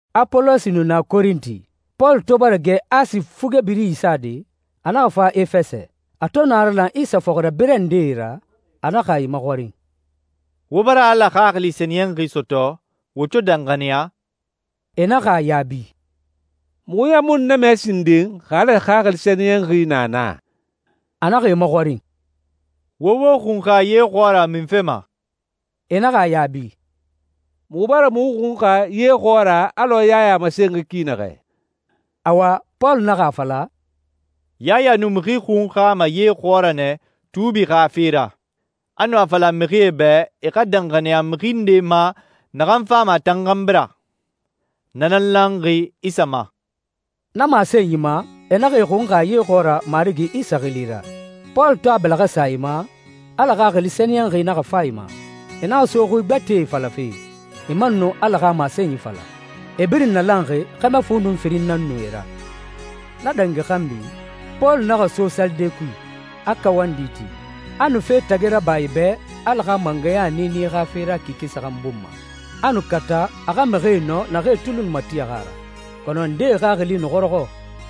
Apolosi nu na Korinti. Pɔlu to bara gɛ Asi fuge biri isade, a naxa fa Efɛsɛ. A to naralan Isa fɔxirabirɛ ndee ra, a naxa e maxɔrin, «Wo bara Ala Xaxili Sɛniyɛnxi sɔtɔ wo to danxaniya?» E naxa a yaabi, «Muxu ɲan mu nu na mɛ sinden xa Ala Xaxili Sɛniyɛnxi na na.» A naxa e maxɔrin, «Wo wo xunxa ye xɔɔra munfe ma?» E naxa a yaabi, «Muxu bara muxu xunxa ye xɔɔra alɔ Yaya a masenxi ki naxɛ.» Awa, Pɔlu naxa a fala, «Yaya nu mixi xunxama ye xɔɔra nɛ tuubi xa fe ra. A nu a fala mixie bɛ, e xa danxaniya mixi nde ma naxan fama a tan xanbi ra. Na nan lanxi Isa ma.» Na masenyi ma e naxa e xunxa ye xɔɔra Marigi Isa xili ra. Pɔlu to a bɛlɛxɛ sa e ma, Ala Xaxili Sɛniyɛnxi naxa fa e ma. E naxa so xui gbɛtɛe falafe, e man nu Ala xa masenyi fala. E birin nalanxi, xɛmɛ fu nun firin nan nu e ra. Na dangi xanbi, Pɔlu naxa so salide kui, a kawandi ti. A nu fe tagi raba e bɛ Ala xa mangɛya niini xa fe ra kike saxan bun ma. A nu kata a xa mixie nɔ naxee tuli nu matixi a ra. Kɔnɔ ndee xaxili nu xɔrɔxɔ,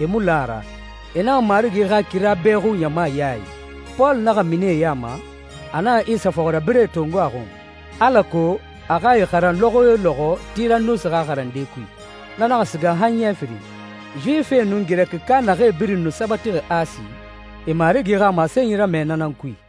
e mu la a ra. E naxa Marigi xa kira bɛxu ɲama ya i. Pɔlu naxa mini e ya ma, a naxa Isa fɔxirabirɛe tongo a xun, alako a xa e xaran lɔxɔ yo lɔxɔ Tiranusi xa xarande kui. Na naxa siga han ɲɛ firin. Yuwifie nun Girɛkika naxee birin nu sabatixi Asi, e Marigi xa masenyi ramɛ na nan kui.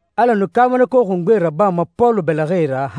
Ala nu kaabanako xungbee rabama Pɔlu bɛlɛxɛe ra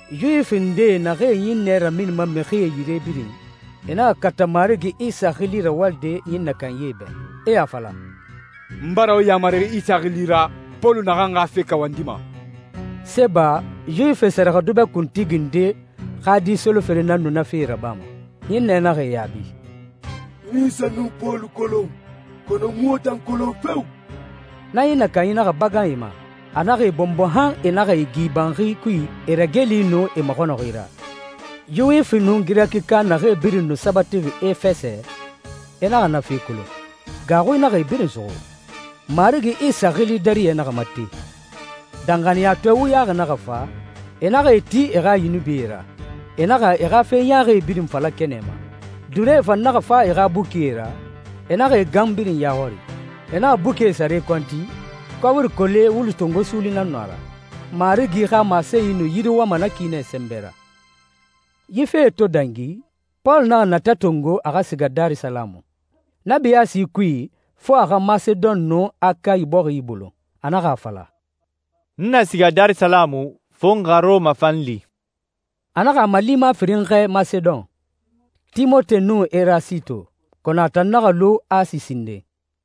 Yuwifie ndee naxee ɲinnɛ raminima mixie yire birin, e naxa kata Marigi Isa xili rawalide ɲinnɛ kanyie bɛ. E a fala, «N bara wo yaamari Isa xili ra Pɔlu naxan xa fe kawandima.» Seba, Yuwifie sɛrɛxɛdubɛ kuntigi nde, xa di solofere nan nu na fe rabama. Ɲinnɛ naxa e yaabi, «N Isa nun Pɔlu kolon, kɔnɔ n mu wo tan kolon feo!» Na ɲinnɛ kanyi naxa bagan e ma, a naxa e bɔnbɔ han e naxa e gi banxi kui e rageli nun e maxɔnɔxi ra. Yuwifi nun Girɛkika naxee birin nu sabatixi Efɛsɛ, e naxa na fe kolon. Gaaxui naxa e birin suxu. Marigi Isa xili dariyɛ naxa mate. Danxaniyatɔɛ wuyaxi naxa fa, e naxa e ti e xa yunubie ra, e naxa e xa fe ɲaaxi birin fala kɛnɛ ma. Duuree fan naxa fa e xa bukie ra, e naxa e gan birin ya xɔri. E naxa bukie sare kɔnti, kɔbiri kole wulu tongo suuli nan nu a ra. Marigi xa masenyi nu yiriwama na ki nɛ sɛnbɛ ra. Yi fee to dangi, Pɔlu naxa natɛ tongo a xa siga Darisalamu. Na biyaasi kui fo a xa Masedon nun Akayi bɔxi ibolon. A naxa a fala, «N na siga Darisalamu, fo n xa Rɔma fan li.» A naxa a malima firin xɛɛ Masedon, Timote nun Erasito, kɔnɔ a tan naxa lu Asi sinden.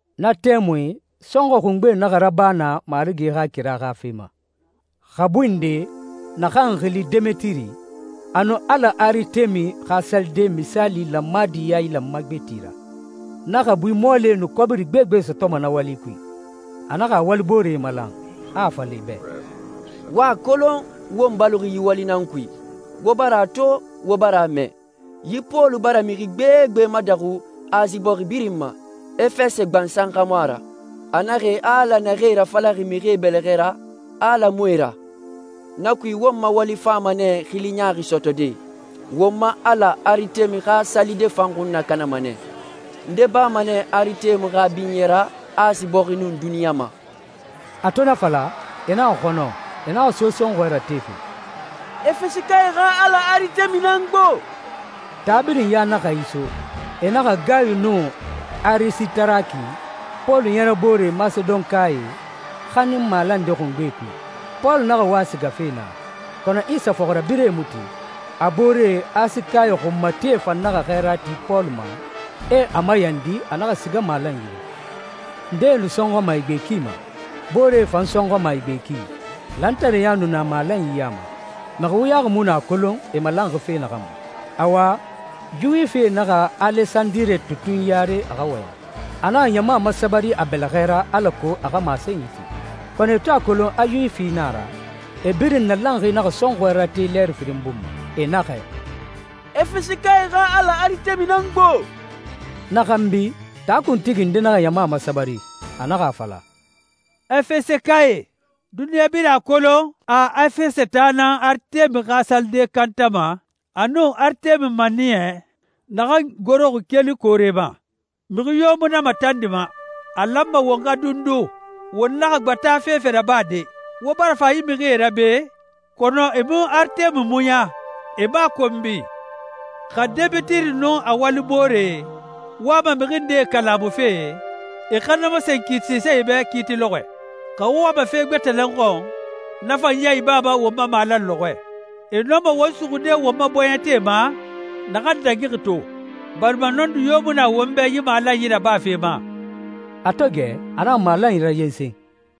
Na tɛmui sɔnxɔɛ xungbe naxa raba naa Marigi xa kira xa fe ma. Xabui nde, naxan xili Demetiri, a nu ala Aritemi xa salide misaali lanmadi yailanma gbeti ra. Na xabui mɔɔlie nu kɔbiri gbegbe sɔtɔma na wali kui. A naxa a walibooree malan, a a fala e bɛ, «Wo a kolon, won baloxi yi wali nan kui. Wo bara a to, wo bara a mɛ, yi Pɔlu bara mixi gbegbe madaxu Asi bɔxi birin ma, Efɛsɛ gbansan xa mu a ra. A naxɛ a alae naxee rafalaxi mixie bɛlɛxɛ ra, a ala mu e ra. Na kui won ma wali fama nɛ xili ɲaaxi sɔtɔde. Won ma ala Aritemi xa salide fan xun nakanama nɛ. Nde bama nɛ Aritemi xa binyɛ ra Asi bɔxi nun duniɲa ma.» A to na fala, e naxa xɔnɔ, e naxa so sɔnxɔɛ ratefe, «Efɛsɛkae xa ala Aritemi nan gbo.» Taa birin ya naxa iso. E naxa Gayu nun Arisitaraki, Pɔlu ɲɛrɛboore Masedonkae, xanin malande xungbe kui. Pɔlu naxa wa sigafe naa, kɔnɔ Isa fɔxirabirɛe mu tin. A booree Asikae xunmatie fan naxa xɛɛra ti Pɔlu ma, e a mayandi a naxa siga malan yire. Ndee nu sɔnxɔma e gbe ki ma. Booree fan sɔnxɔma e gbe ki. Lantareya nu na malanyi ya ma. Mixi wuyaxi mu nu a kolon e malanxi fe naxan ma. Awa, Yuwifie naxa Alesandire tutun yare a xa wɔyɛn. A naxa ɲama masabari a bɛlɛxɛ ra alako a xa masenyi ti. Kɔnɔ, e to a kolon a Yuwifi nan a ra, e birin nalanxi naxa sɔnxɔɛ rate lɛɛri firin bun ma. E naxɛ, «Efɛsɛkae xa ala Aritemi nan gbo.» Na xanbi, taa kuntigi nde naxa ɲama masabari, a naxa a fala, «Efɛsɛkae, duniɲa birin a kolon a Efɛsɛ taa nan Aritemi xa salide kantama a nun Aritemi maniyɛ, naxan goroxi keli koore ma. Mixi yo mu na matandima. A lanma wo xa dundu. Wo naxa gbata fefe rabade. Wo bara fa yi mixie ra be, kɔnɔ e mu Aritemi muɲa, e mu a konbi. Xa Demetiri nun a walibooree wama mixi nde kalamufe, e xa na masen kiitisae bɛ kiiti lɔxɔɛe. Xa wo wama fe gbɛtɛ nan xɔn, na fan ya ibama won ma malan lɔxɔɛ. E nɔma won suxude won ma bɔɲɛte ma naxan dangixi to, barima nɔndi yo mu na won bɛ yi malanyi rabafe ma.» A to gɛ, a naxa malanyi rayensen.